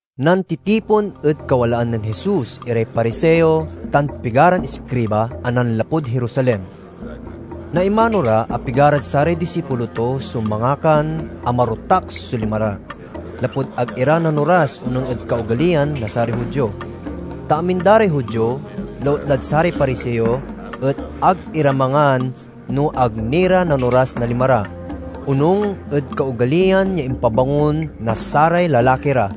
Nantitipon ed kawalaan nen Jesus iray Pariseo tan pigaran iskriba a nanlapud Jerusalem. Naimano ra a pigarad saray disipulo to so mangakan a marotak so lima ra, lapud ag ira nanoras onung ed kaogaliyan na saray Judio. Ta amin da ray Judio, lautlad saray Pariseo, et ag ira mangan no ag ni ra nanoras na lima ra, onung ed kaogaliyan ya impabangon na saray lalaki ra.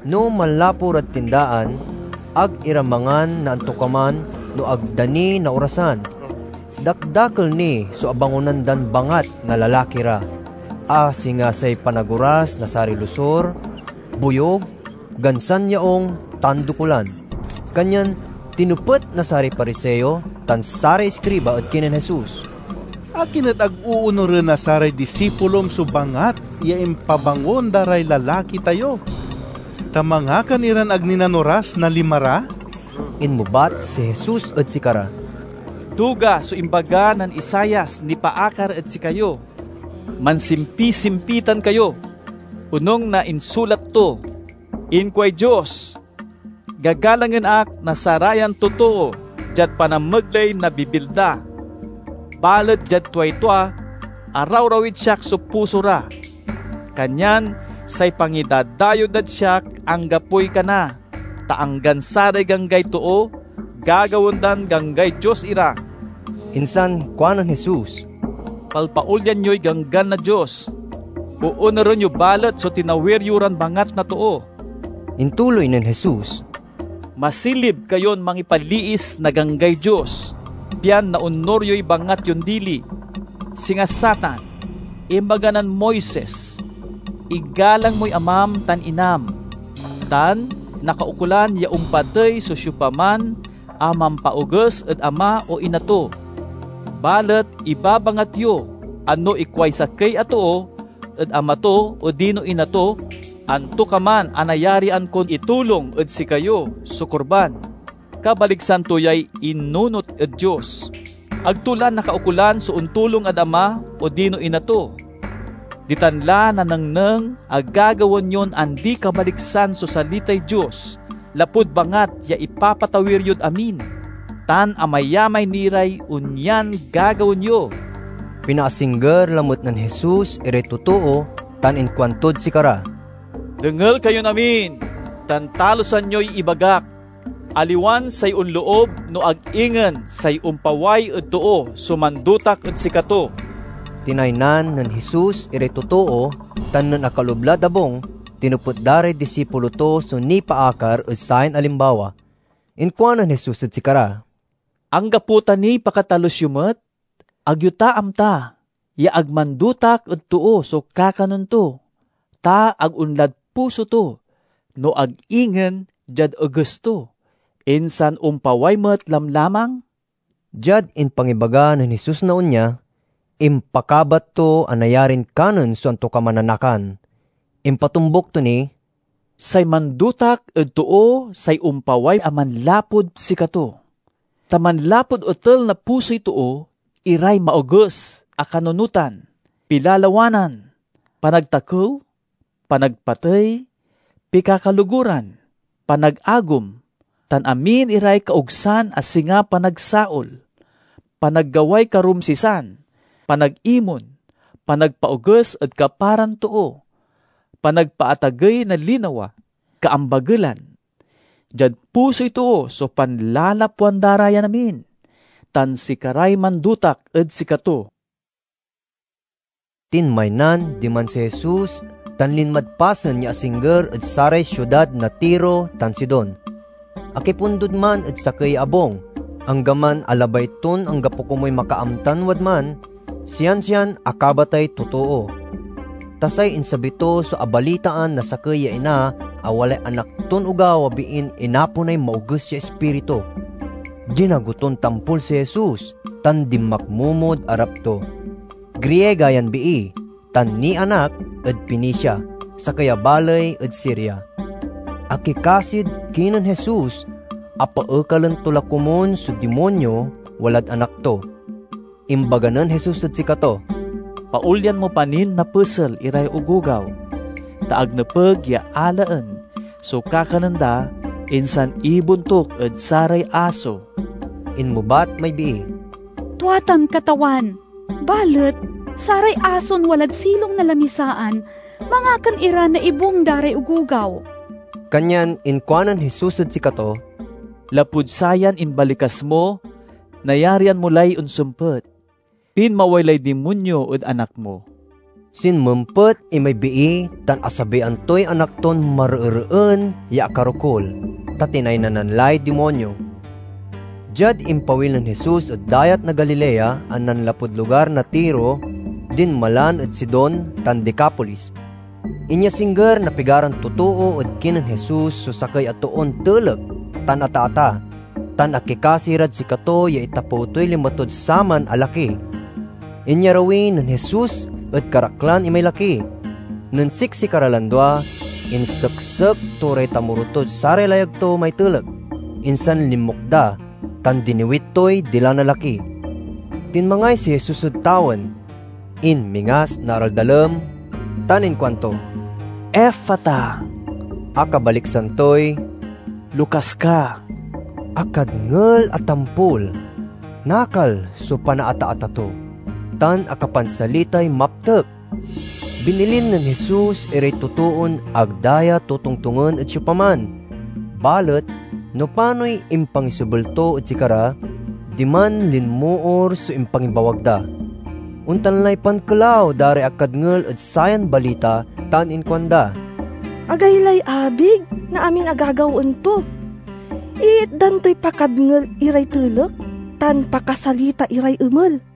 No manlapu ra tindaan, ag ira mangan na antokaman no ag da ni naorasan. Dakdakel ni so abangonan dan bangat na lalaki ra, a singa say panagoras na saray losur, boyug, gansan yaung, tan dokulan. Kanyan tinepet na saray Pariseo tan saray iskriba ed kinen Jesus, "Akin et ag oonuren na saray disipulom so bangat ya impabangon da ray lalaki tayo, ta mangakan iran ag ni nanoras na lima ra?" Inmebat si Jesus ed sikara, "Duga so imbaga nen Isaias nipaakar ed sikayo. Mansimpisimpitan kayo, onung na insulat to: 'Inkuay Dios— Gagalangen ak na sarayan totoo diad panamegley na bibil da; balet diad tuay tua, arawrawid siak so puso ra. Kanyan say pangidadayew dad siak anggapoy kana, ta anggan saray ganggay too gagawaen dan ganggay Dios ira!'" Insan kuanen Jesus, "Palpaolyan yoy ganggan na Dios, oonuren yo balet so tinawir yo ran bangat na too." Intuloy nen Jesus, "Masilib kayon mangipaliis na ganggay Dios, pian naonur yoy bangat yon dili. Singa satan, imbaga nen Moises, 'Igalang moy amam tan inam,' tan, 'Nakaukolan ya ompatey so siopaman a mampaoges ed ama o ina to.' Balet ibabangat yo a no ikuay sakey a too ed ama to odino ina to, 'Antokaman a nayarian kon itulong ed sikayo so Korban' (kabaliksan to yay innunot ed Dios), ag to la nakaukolan so ontulong ed ama odino ina to. Ditan la nanengneng a gagawaen yon andikabaliksan so salitay Dios lapud bangat ya ipapatawir yod amin. Tan amayamay ni ray onyan gagawaen yo." Pinaasingger lamet nen Jesus iray totoo tan inkuantod sikara, "Dengel kayon amin tan talusan yoy ibagak. Aliwan say onloob no ag ingen say ompaway ed too so mandotak ed sikato." Tinaynan nen Jesus iray totoo tan nen akaloob lad abung, tinepet da ray disipulo to so nipaakar ed sayan alimbawa. Inkuanen Jesus ed sikara, "Anggapo ta niy pakatalus yo met? Ag yo ta amta ya ag mandotak ed too so kakanen to, ta ag onlad puso to, no ag ingen diad eges to, insan ompaway met lamlamang?" (Diad impangibaga nen Jesus na onya, impakabat to a nayarin kanen so antokaman a nakan.) Impatombuk to ni, "Say mandotak ed too say ompaway a manlapud sikato. Ta manlapud otel na pusoy too iray maoges a kanunotan, pilalawanan, panagtakew, panagpatey, pikakaloguran, panagagom, tan amin iray kaogsan a singa panagsaol, panaggaway karumsisan, panagimon, panagpaoges ed kaparan too, panagpaatagey na linawa, kaambagelan. Diad pusoy too so panlalapwan da ra yan amin, tan sikaray mandotak ed sikato." Tinmaynan diman si Jesus tan linmad pasen ya asingger ed saray siudad na Tiro tan Sidon. Akipundod man ed sakey ya abung. Anggaman a labay ton anggapo komuy makaamtan wadman, siansian akabatay totoo. Ta say insabi to so abalitaan na sakey ya ina a walay anak ton ogaw a biin inaponay maoges ya ispiritu. Dinago ton tampol si Jesus tan dinmakmomod arap to. Griega yan bii tan nianak ed Fenicia, sakey baley ed Siria. Akikasid kinen Jesus a paekalen to la komun so dimonyo walad anak to. Imbaga nen Jesus ed sikato, "Paolyan mo pa nin napesel iray ogogaw, ta ag nepeg ya alaen so kakanen da insan ibontuk ed saray aso." Inmebat may bii, "Tua tan Katawan, balet saray ason walad silong na lamisaan mangakan ira na ibung da ray ogogaw." Kanyan inkuanen Jesus ed sikato, "Lapud sayan imbalikas mo, nayarian mo lay onsempet. Pinmaway lay dimonyo ed anak mo." Sinmempet imay bii tan asabian toy anak ton mareereen ya akarokul, ta tinaynanan lay dimonyo. Diad impawil nen Jesus ed Dayat na Galilea a nanlapud lugar na Tiro, dinmalan ed Sidon tan Decapolis. Inyasingger na pigaran totoo ed kinen Jesus so sakey a toon telek tan ataata, tan akikasi rad sikato ya itapew toy lima tod saman a laki. Inyarawi nen Jesus ed karaklan imay laki. Nen siksikara lan dua, inseksek to ray tamoro tod saray layag to may telek. Insan linmukda tan diniwit toy dila na laki. Tinmangay si Jesus ed tawen, inmingas na araldalem, tan inkuanto, "Ephphatha," a kabaliksan toy, "Lokas ka!" Akadngel a tampol nakal so panaataata to, tan akapansalitay maptek. Binilin nen Jesus iray totoon ag da ya totongtongen ed siopaman, balet no panoy impangisebel to ed sikara, diman linmoor so impangibawag da. Ontan lay pankelaw da ray akadngel ed sayan balita tan inkuanda, "Agaylay abig na amin a gagawaen to! Iitdan toy pakadngel iray telek, tan pakasalita iray emel!"